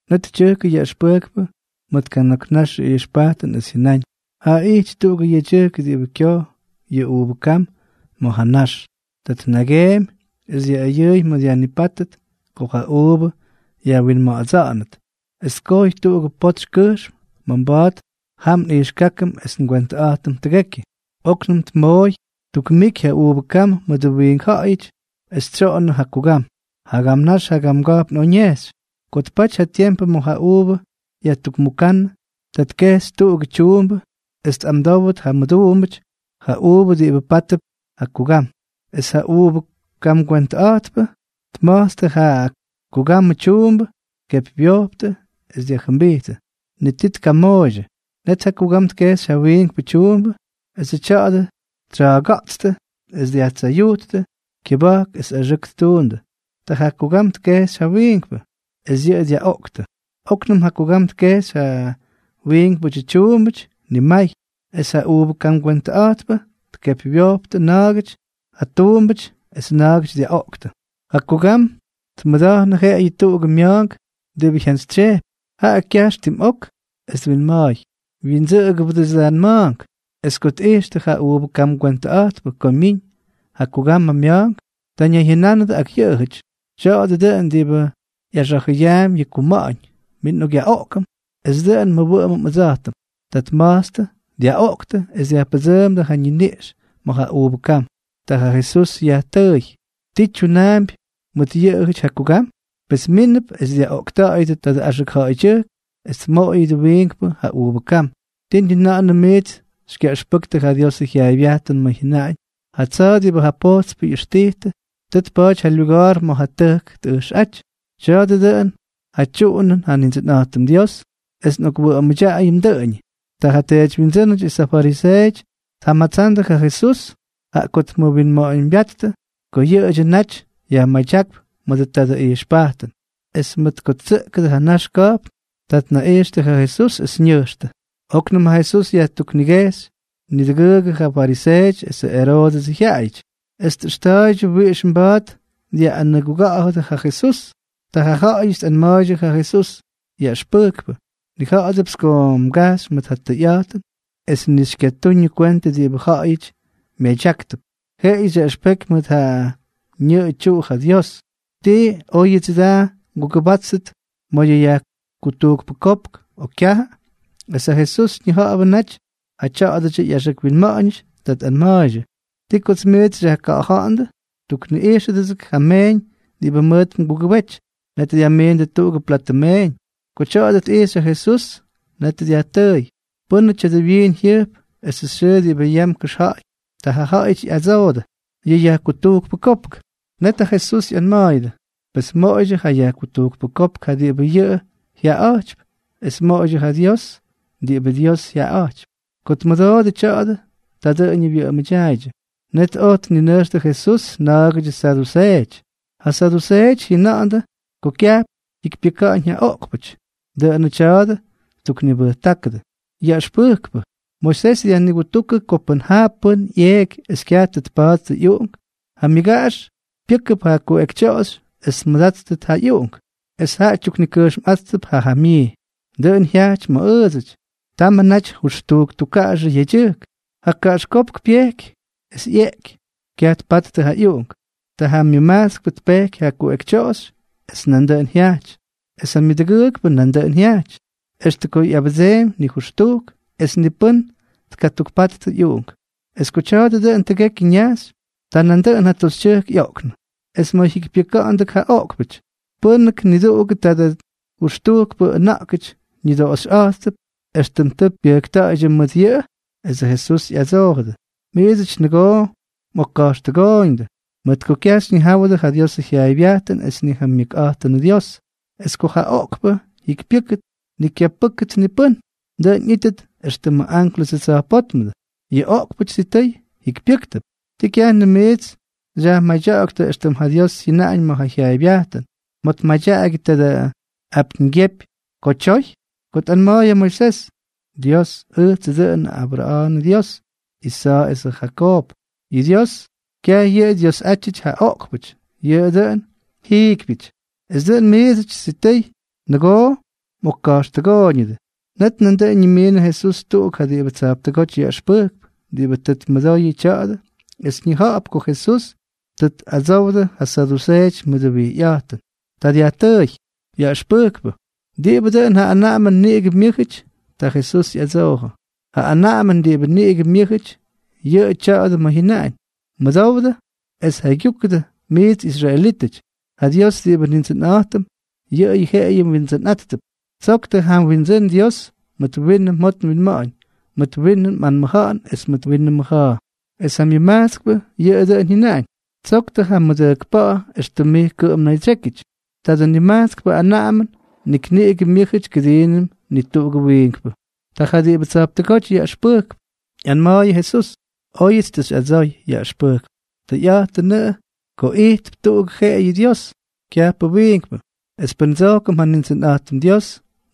Net tyʉjkʉ yaꞌʉxpʉjkpʉ mʉt kana̱k nax ijxpajtʉn es jyʉnáñ: —Jaa ijty tuꞌugʉ yedyʉjk diꞌibʉ kyoj yʉ uuvʉ kam ma̱ ja ñax. Ta tnageemy es dyaꞌʉyʉʉy ma̱ dyajnipátʉt ko ja uuvʉ yajwinma̱ꞌa̱dsa̱ꞌa̱nʉt es tkojy tuꞌugʉ potsy kʉjxm ma̱ mba̱a̱t jam nꞌijxkákʉm es ngwentʉꞌa̱jtʉm tʉgekyʉ. Oknʉm tmooy tukmiky ja uuvʉ kam mʉdʉ wiink ja̱ꞌa̱yʉty es tsyoꞌonnʉ ja kugam. Jagam nax jagamga̱jpn oj ñejxy. ’Ko tpaty ja tiempʉ ma̱ ja uuvʉ yajtujkmukánnʉ, ta tkejxy tuꞌugʉ tyuumbʉ es tꞌamdówʉt ja mʉduumbʉty ja uuvʉ diꞌibʉ pátʉp ja kugam. Es ja uuvʉ kamgwentʉꞌa̱jtpʉ tma̱jtstʉ ja kugamʉ tyuumbʉ, tkepywyojptʉ es dyajjʉmbijttʉ. Ni tii tkamooydyʉ. Net ja kugam tkejxy ja wiinkpʉ tyuumbʉ, es tya̱a̱dʉ ttsa̱a̱ga̱ꞌtstʉ es dyajtsayujttʉ kyʉba̱jk es axʉʉk ttuundʉ. Ta ja kugam tkejxy ja wiinkpʉ, es yʉꞌʉ dyaꞌoꞌktʉ. Oknʉm ja kugam tkejxy ja wiinkpʉdyʉ tyuumbʉty nimay, es ja uuvʉ kamgwentʉꞌa̱jtpʉ tkepywyojptʉ na̱a̱gʉty ja tuumbʉty es na̱a̱gʉty dyaꞌoꞌktʉ. ’Ja kugam tmʉda̱jnʉ jeꞌeyʉ tuꞌugʉ mya̱a̱nk diꞌibʉ jyantsytsyejpy, jaꞌa kyajx tim ok es twinma̱a̱y: “Wyindsʉꞌʉgʉbʉdʉts ja nma̱a̱nk.” Es ko tꞌijxtʉ ja uuvʉ kamgwentʉꞌa̱jtpʉ ko myiñ ja kugamʉ mya̱a̱nk, ta ñayjyʉnánʉdʉ ak yʉꞌʉjʉty: “Tya̱a̱dʉ dʉꞌʉn diꞌibʉ ꞌyaxa̱jʉyaampy yʉ kyuma̱ꞌa̱ñ. Min nꞌokꞌyaꞌoꞌkʉm, es dʉꞌʉn nmʉwʉꞌʉmʉm ʉdsa̱jtʉm.” ’Ta tma̱jtstʉ, dyaꞌoꞌktʉ es dyajpʉdsʉʉmdʉ ja ñiniꞌx ma̱ ja uuvʉ kam. Ta ja Jesús yajtʉʉy: —¿Ti tyunaampy mʉt yʉꞌʉjʉty ja kugam? Pes mínʉp es dyaꞌoꞌkta̱ꞌa̱yʉdʉ tadʉ axʉk ja̱ꞌa̱ydyʉjk, es tmoꞌoyʉt wiinkpʉ ja ꞌyuuvʉ kam. ’¿Tii ni na̱ꞌa̱nʉm miits xykyaꞌʉxpʉktʉ ja Diosʉ jyaaybyajtʉn ma̱ jyʉnaꞌañ?: Ja tsa̱a̱ diꞌibʉ ja pojtspʉty ꞌyʉxtijtʉ, tʉ tpa̱a̱ty ja lyuga̱a̱r ma̱ ja tʉjk tꞌʉjxꞌáty. Tya̱a̱dʉ dʉꞌʉn ja tyuꞌunʉn ja Nindsʉnꞌa̱jtʉm Dios, es nꞌokwʉꞌʉmʉdyaꞌayʉm dʉꞌʉñʉ. Ta ja teedywyindsʉ́nʉty es ja fariseeʉty tjamatsandʉ ja Jesús, jaꞌa ko tmʉwinma̱ꞌa̱ñbyáttʉ ko yʉꞌʉdyʉ naty yajmadyákp mʉdʉ tadʉ ijxpajtʉn. Es mʉt ko tsyʉꞌkʉdʉ ja nax ka̱jpn, ta tnaꞌijxtʉ ja Jesús es ñʉjxtʉ. Oknʉm ja Jesús yajtuknikejxy niduꞌugʉty ja fariseeʉty esʉ Eroodʉsʉ jyaꞌayʉty, es tꞌʉxta̱a̱ydyʉ wiꞌix mba̱a̱t dyaꞌꞌanʉguga̱ꞌa̱dʉ ja Jesús. Ta jaꞌajʉty tꞌanma̱a̱ydyʉ ja Jesús: —Yaꞌʉxpʉjkpʉ, nnija̱ꞌa̱dʉpts ko mgajxy mʉt ja tʉyꞌa̱jtʉn es ni xykyatuñʉ kwentʉ diꞌibʉ ja̱ꞌa̱yʉty myadyáktʉp. Jeꞌeyʉ xyaꞌʉxpeky mʉt ja ñʉꞌʉ tyuꞌu ja Dios. ¿Tii óyʉdsʉ da ngugʉbátʉt ma̱ yʉ yajkutujkpʉ kopk, o kyajʉ? Es ja Jesús ñija̱ꞌa̱bʉ naty ja tyá̱dʉdyʉ ꞌyaxʉk winma̱ꞌa̱ñʉty. Ta tꞌanma̱a̱ydyʉ: —¿Ti kots miits xyajka̱ꞌa̱ja̱ꞌa̱ndʉ? Tukꞌijxtʉgʉts ja meeñ diꞌibʉ mʉʉt mgugʉbety. Net dyajmiindʉ tuꞌugʉ platʉ meeñ. Ko tya̱a̱dʉ tꞌijxy ja Jesús, net dyajtʉʉy: —¿Pʉ́nʉ tya̱dʉ wyiin jyʉjp esʉ xyʉʉ diꞌibʉ yam kʉxja̱ꞌa̱y? Ta jaꞌajʉty ꞌyadsoodʉ: —Yʉ yajkutujkpʉ kopk. Net ja Jesús ꞌyanma̱a̱yʉdʉ: —Pes moꞌoydyʉ ja yajkutujkpʉ kopk ja diꞌibʉ yʉꞌʉ jyaꞌaꞌa̱jtypy, es moꞌoydyʉ ja Dios diꞌibʉ Dios jyaꞌaꞌa̱jtypy. Ko tmʉdoodʉ tya̱a̱dʉ, ta dʉꞌʉñʉ wyʉꞌʉmʉdyaaydyʉ. Net oj tninʉjxtʉ Jesús na̱a̱gʉdyʉ saduseeʉty. Ja saduseeʉty jyʉna̱ꞌa̱ndʉ ko kyajp jyikypyʉka̱ꞌa̱ñ ja oꞌkpʉty. Dʉꞌʉnʉ tya̱a̱dʉ ttuknibʉjtákʉdʉ: —Yaꞌʉxpʉjkpʉ, Moisés dyajnigutúkʉ ko pʉn ja pʉ́n ꞌyeeky es kyaj tʉ tpattʉ ꞌyuꞌunk, ja myʉgaꞌax pyʉ́kʉp ja kuꞌekytyoꞌoxy es tmʉdáttʉt ja ꞌyuꞌunk, es jaꞌa tyuknikʉjxmꞌátʉp ja jamyii. Dʉꞌʉn jyajty ma̱ ʉʉdsʉty. Tamʉ naty jʉxtujk tukkaꞌaxʉ yedyʉjk. Ja kaꞌaxkópk pyejky, es ꞌyeꞌky, kyaj tpattʉ ja ꞌyuꞌunk. Ta ja myʉmajtskpʉ tpejky ja kuꞌekytyoꞌoxy, es nandʉꞌʉn jyajty. Es ja myʉdʉgʉʉkpʉ nandʉꞌʉn jyajty, extʉ ko ꞌyabʉdseemy nijʉxtujk, es ni pʉ́n tkatukpattʉ ꞌyuꞌunk. Es ko tya̱a̱dʉ dʉꞌʉn tʉgekyʉ ñajxy, ta nandʉꞌʉn ja toxytyʉjk ꞌyoꞌknʉ. Es ma̱ jyikypyʉka̱ꞌa̱ndʉk ja oꞌkpʉty, ¿pʉ́nʉk niduꞌugʉ tadʉ jʉxtujkpʉ ʉna̱ꞌkʉty ñʉdoꞌoxyꞌátʉp, éxtʉm tʉ pyʉjkta̱ꞌa̱ydyʉ mʉt yʉꞌʉ? Esʉ Jesús ꞌyadsoojʉdʉ: —Miidsʉty nʉgoo mꞌokka̱jxtʉgooyñʉdʉ, mʉt ko kyaj xyñijáwʉdʉ ja Diosʉ jyaaybyajtʉn es ni ja myʉkꞌa̱jtʉnʉ Dios. Es ko ja oꞌkpʉ jyikypyʉ́ktʉt, ni kyapʉ́ktʉt ni pʉ́n, dʉꞌʉn ꞌyíttʉt éxtʉmʉ ánklʉsʉ tsa̱jpótmʉdʉ. Yʉ oꞌkpʉty sitʉy jikypyʉ́ktʉp. ¿Tii kyajnʉm miits xyajmadya̱ꞌa̱ktʉ éxtʉm ja Dios jyʉnáñ ma̱ ja jyaaybyajtʉn, ma̱ tmadyaꞌagyʉ tadʉ apyñgyepy ko tyoy?, ko tꞌanma̱a̱y ja Moisés: “Ʉjtsʉ dʉꞌʉn ja Abra̱a̱nʉ Dyios, Isa̱a̱ esʉ Jakoob.” Yʉ Dios, kyaj yʉꞌʉ Dyiosꞌátyʉty ja oꞌkpʉty, yʉꞌʉ dʉꞌʉn ja jiikypyʉty. Es dʉꞌʉn miidsʉty sitʉy nʉgoo mꞌokka̱jxtʉgooyñʉdʉ. Net nandʉꞌʉn ñimiinʉ Jesús tuꞌuk ja diꞌibʉ tsa̱jptʉgóty yaꞌʉxpʉjkp, diꞌibʉ tʉ tmʉdoyʉ tya̱a̱dʉ es ñija̱ꞌa̱p ko Jesús tʉ tꞌadsoodʉ ja saduseeʉty mʉdʉ wijyꞌa̱jtʉn. Ta dyajtʉʉy: —Yaꞌʉxpʉjkpʉ, ¿diꞌibʉ dʉꞌʉn ja anaꞌamʉn niꞌigʉ myʉ́jʉty? Ta Jesús ꞌyadsoojʉ: —Ja anaꞌamʉn diꞌibʉ niꞌigʉ myʉ́jʉty, yʉꞌʉ tya̱a̱dʉ ma̱ jyʉnaꞌañ: “Mʉdowdʉ es jaygyúkʉdʉ, miits israelítʉty: ja Dios diꞌibʉ Nindsʉnꞌa̱jtʉm, yʉꞌʉyʉ jeꞌeyʉ Windsʉnꞌa̱jtp. Tsoktʉ ja mWindsʉ́n Dios mʉt winʉ mjot mwinma̱ꞌa̱ñ, mʉt winʉ mꞌanmʉja̱ꞌa̱n es mʉt winʉ mmʉja̱a̱.” Es ja myʉmajtskpʉ yʉꞌʉ dʉꞌʉn jyʉnaꞌañ: “Tsoktʉ ja mmʉdʉjkpa̱ꞌa̱ éxtʉm mij kʉꞌʉm mnaydsyékyʉty.” Tadʉ nimajtskpʉ anaꞌamʉn nik niꞌigʉ myʉ́jʉty kʉdiinʉm ni tuꞌugʉ wiinkpʉ. Ta ja diꞌibʉ tsa̱jptʉgóty yaꞌʉxpʉjkp ꞌyanma̱a̱yʉ Jesús: —Oyʉts tʉ xyꞌadsoy, yaꞌʉxpʉjkpʉ. Tʉyꞌa̱jtʉnʉꞌʉ ko ijtp tuꞌuk jeꞌeyʉ Dios, kyajpʉ wiinkpʉ. Es pʉn ndsojkʉm ja Nindsʉnꞌa̱jtʉm Dios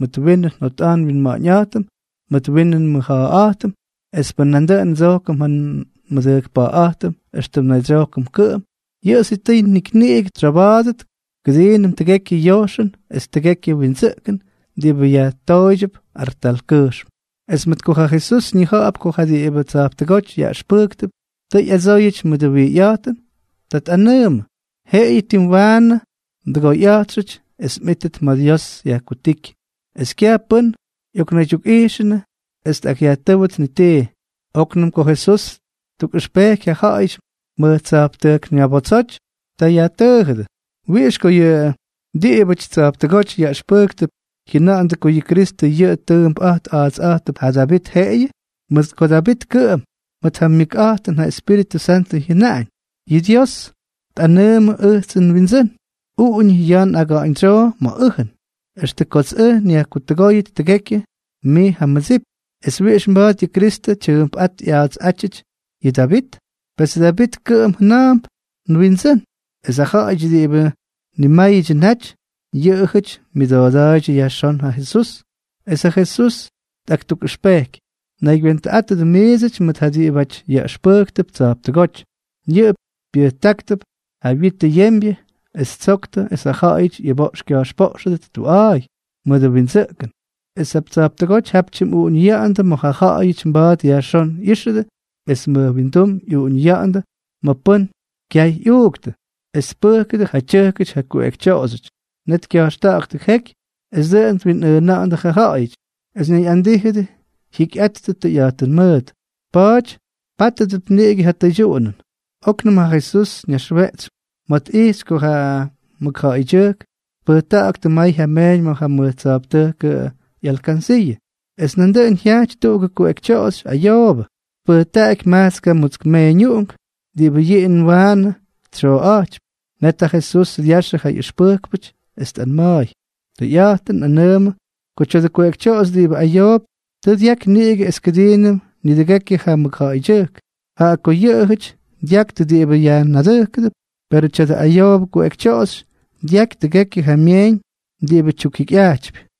mʉt winʉ njot nwinma̱ꞌa̱ñꞌa̱jtʉm, mʉt winʉ nmʉja̱a̱ꞌa̱jtʉm es pʉn nandʉꞌʉn ndsojkʉm ja nmʉdʉjkpa̱ꞌa̱ꞌa̱jtʉm éxtʉm nnaydsyojkʉm kʉꞌʉm, yʉꞌʉ sitʉy nik niꞌigʉ tsyoba̱a̱dʉt kʉdiinʉm tʉgekyʉ yojxʉn es tʉgekyʉ windsʉꞌkʉn diꞌibʉ yajtooydyʉp artalkʉjxm. Es mʉt ko ja Jesús ñija̱ꞌa̱p ko ja diꞌibʉ tsa̱jptʉgóty yaꞌʉxpʉjkp tʉ ꞌyadsooyʉty mʉdʉ wijyꞌa̱jtʉn, ta tꞌanʉʉmʉ: —Jeꞌeyʉ tim waanʉ mdʉgoyꞌa̱jtxʉty es mꞌítʉt ma̱ Dios yajkutíky. Es kyaj pʉ́n ꞌyoknaydyukꞌaꞌijxʉnʉ es tꞌakꞌyajtʉ́wʉt ni tii. Oknʉm ko Jesús ttukꞌʉxpejky ja ja̱ꞌa̱yʉty mʉj tsa̱jptʉjk ñabotsoty. Ta yajtʉʉjʉdʉ: —¿Wiꞌix ko yʉ diꞌibʉty tsa̱jptʉgóty yaꞌʉxpʉjktʉp jyʉna̱ꞌa̱ndʉ ko yʉ Kristʉ yʉꞌʉ tʉʉmpꞌa̱jt a̱a̱tsꞌa̱jtʉp ja Davit jeꞌeyʉ? Mʉt ko Davit kʉꞌʉm, mʉt ja myʉkꞌa̱jtʉn ja Espíritʉ Santʉ jyʉnaꞌañ: Yʉ Dios tꞌanʉʉmʉ ʉjtsʉ nWindsʉ́n: “Uꞌuñʉ ya̱a̱ aga̱ꞌa̱ñdsyoo ma̱ ʉjʉn, extʉ kots ʉj nyajtʉgóyʉt tʉgekyʉ mij ja mmʉdsip.” ¿Es wiꞌix mba̱a̱t yʉ Kristʉ tyʉʉmpꞌáty ꞌya̱a̱tsꞌátyʉty yʉ Davit? Pes Davit kʉꞌʉm jʉna̱a̱mp nWindsʉ́n. Es ja ja̱ꞌa̱yʉty diꞌibʉ nimáyʉdyʉ naty, yʉꞌʉjʉty myʉdooda̱a̱ydyʉ yajxón ja Jesús. Es ja Jesús tꞌaktukꞌʉxpejky: —Naygywentʉꞌátʉdʉ miidsʉty mʉt ja diꞌibʉty yaꞌʉxpʉjktʉp tsa̱jptʉgóty. Yʉꞌʉ pyʉjtáktʉp ja witʉ yembyʉ es ttsoktʉ es ja ja̱ꞌa̱yʉty ꞌyʉboꞌx kya̱jxpoꞌxʉdʉt tuꞌa̱a̱y mʉdʉ windsʉꞌkʉn, es tsa̱jptʉgóty jap tyimꞌuꞌuñʉya̱ꞌa̱ndʉ ma̱ ja ja̱ꞌa̱yʉty mba̱a̱t yajxón ꞌyíxʉdʉ es mʉj windum ꞌyuꞌuñʉya̱ꞌa̱ndʉ ma̱ pʉ́n kyay ꞌyuuktʉ. Es tpʉjkʉdʉ ja tyʉjkʉty yʉ kuꞌekytyoꞌoxyʉty, net kya̱jxta̱ꞌa̱ktʉ jeky es dʉꞌʉn twinꞌʉʉna̱ꞌa̱ndʉ ja ja̱ꞌa̱yʉty, es ñayꞌandíjʉdʉ jyikyꞌattʉ tʉyꞌa̱jtʉn mʉʉt. Pa̱a̱ty pátʉdʉp niꞌigʉ ja tʉydyuꞌunʉn. Oknʉm ja Jesús ñaxweꞌtsy ma̱ tꞌijxy ko ja mʉkja̱ꞌa̱ydyʉjk tpʉjtáktʉ may ja myeeñ ma̱ ja mʉj tsa̱jptʉjkʉ ꞌyalkansiiʉ. Es nandʉꞌʉn jyaꞌty tuꞌugʉ kuꞌekytyoꞌoxy ayoobʉ, es tpʉjtaꞌaky majtskʉ mutsk meeñuꞌunk diꞌibʉ yiin waanʉ tsyoꞌa̱jtypy. Net ja Jesús dyaxyʉ ja ꞌyʉxpʉjkpʉtʉjk, es tꞌanma̱a̱y: —Tʉyꞌa̱jtʉn nꞌanʉʉmʉ ko tya̱dʉ kuꞌekytyoꞌoxy diꞌibʉ ayoop tʉ dyaky niꞌigʉ es kʉdiinʉm nidʉgekyʉ ja mʉkja̱ꞌa̱yʉty. Jaꞌa ko yʉꞌʉjʉty dyaktʉ diꞌibʉ yajnadʉjkʉp, perʉ tya̱dʉ ayoobʉ kuꞌekytyoꞌoxy dyaky tʉgekyʉ ja myeeñ diꞌibʉ tyukjikyꞌajtypy.